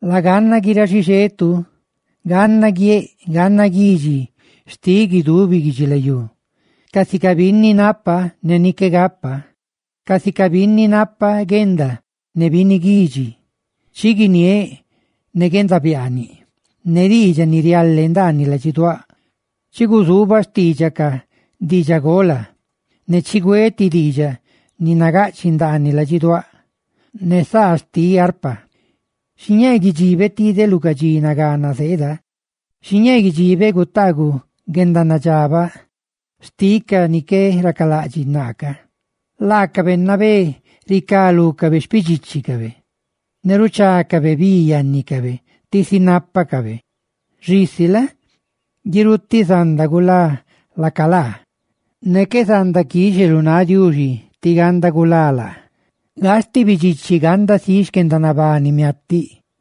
Laganna guiráꞌ xixetu, ganna guieꞌ, ganna guidxi xtiꞌ guidubi guidxilayú, casica binni napa ne ni qué gapa, casica binni napa guenda ne binni guidxi. Chi guiniéꞌ ne guendabiaaniꞌ ne diidxaꞌ ni riale ndaaniꞌ ladxiduáꞌ; chi guzuubaꞌ xtiidxaꞌ ca diidxagola, ne chigüéꞌ ti diidxaꞌ ni gaꞌchiꞌ ndaaniꞌ ladxiduáꞌ ne saa xtiꞌ arpa. Xiñee guidxibeꞌ tideꞌ lu ca dxi nagana zeeda, dxi gutaaguꞌ guendanadxabaꞌ xtiꞌ ca ni qué racalaꞌdxiꞌ naa ca. Laacabe nabé ricá lúcabe xpidxíchicabe, ne ruchácabe bi yannicabe tisi nápacabe, xisi la? guirutiꞌ zanda gulá laaca laa, ne qué zanda quixe lu náꞌ Diuxi tí ganda gulá laa. ¡Gastiꞌ bidxichi ganda siꞌ xquendanabani miatiꞌ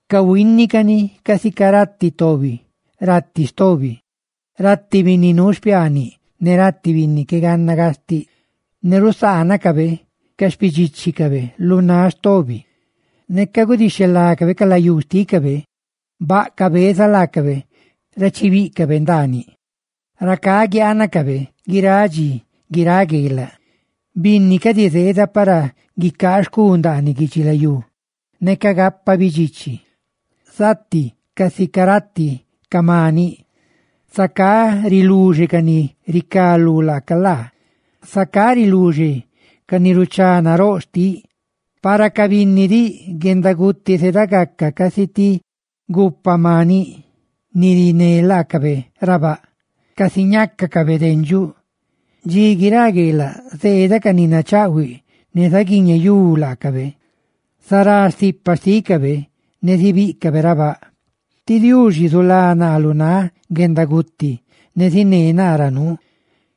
Cahuínicani casica rati tobi rati stobi, rati binni nuu xpiaaniꞌ ne rati binni qué ganna gastiꞌ, ne rusaanacabe ca xpidxíchicabe lu náꞌ stobi. Neca gudixhelácabe ca layú xtícabe, baꞌ cabeza laacabe ra chibíꞌcabe ndaaniꞌ; ¡racá guiaanacabe guiráꞌ dxi, guiráꞌ gueelaꞌ! Binni cadi zeeda para guicaa xcu ndaaniꞌ guidxilayú neca gapa bidxichi; zati casica rati ca maniꞌ. Zacá riluxe ca ni ricá lú laaca laa; zacá riluxe ca ni ruchá naróꞌ xtiꞌ. Para ca binni diꞌ, guendaguti zeeda gaca casi tuuxa ni rapa maniꞌa ni riné laacabe ndaaniꞌ baꞌ casi ñácacabe dendxuꞌ. Dxi guiráꞌ gueelaꞌ, zeeda ca ni nachaꞌhuiꞌ ne zaguiñeyú laacabe; zará stipa xtícabe ne zibíꞌcabe ra baꞌ. Huaxa Diuxi zulá naa lu náꞌ guendaguti, ne ziné naa ra nuu.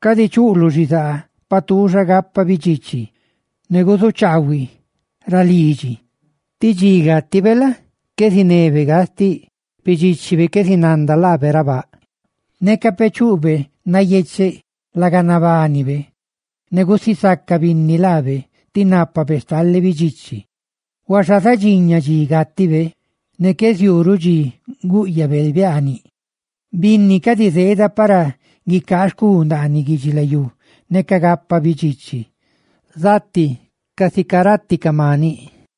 Cadi chuꞌluꞌ xizaa paꞌ tuuxa gapa bidxichi ne guzuchaahuiꞌ ra lidxi, tí dxi gátibe la? qué zinebeꞌ gastiꞌ, xpidxíchibe qué zinanda laabe ra baꞌ. Neca peꞌ chuꞌbe nayecheꞌ laga nabánibe, ne gusisaca binni laabe ti nápabe stale bidxichi, huaxa zadxiña dxi gátibe, ne qué ziuu ruꞌ dxi gúꞌyabe biaaniꞌ. Binni cadi zeeda para guicaa xcu ndaaniꞌ guidxilayú neca gapa bidxichi; zati casica rati ca maniꞌ.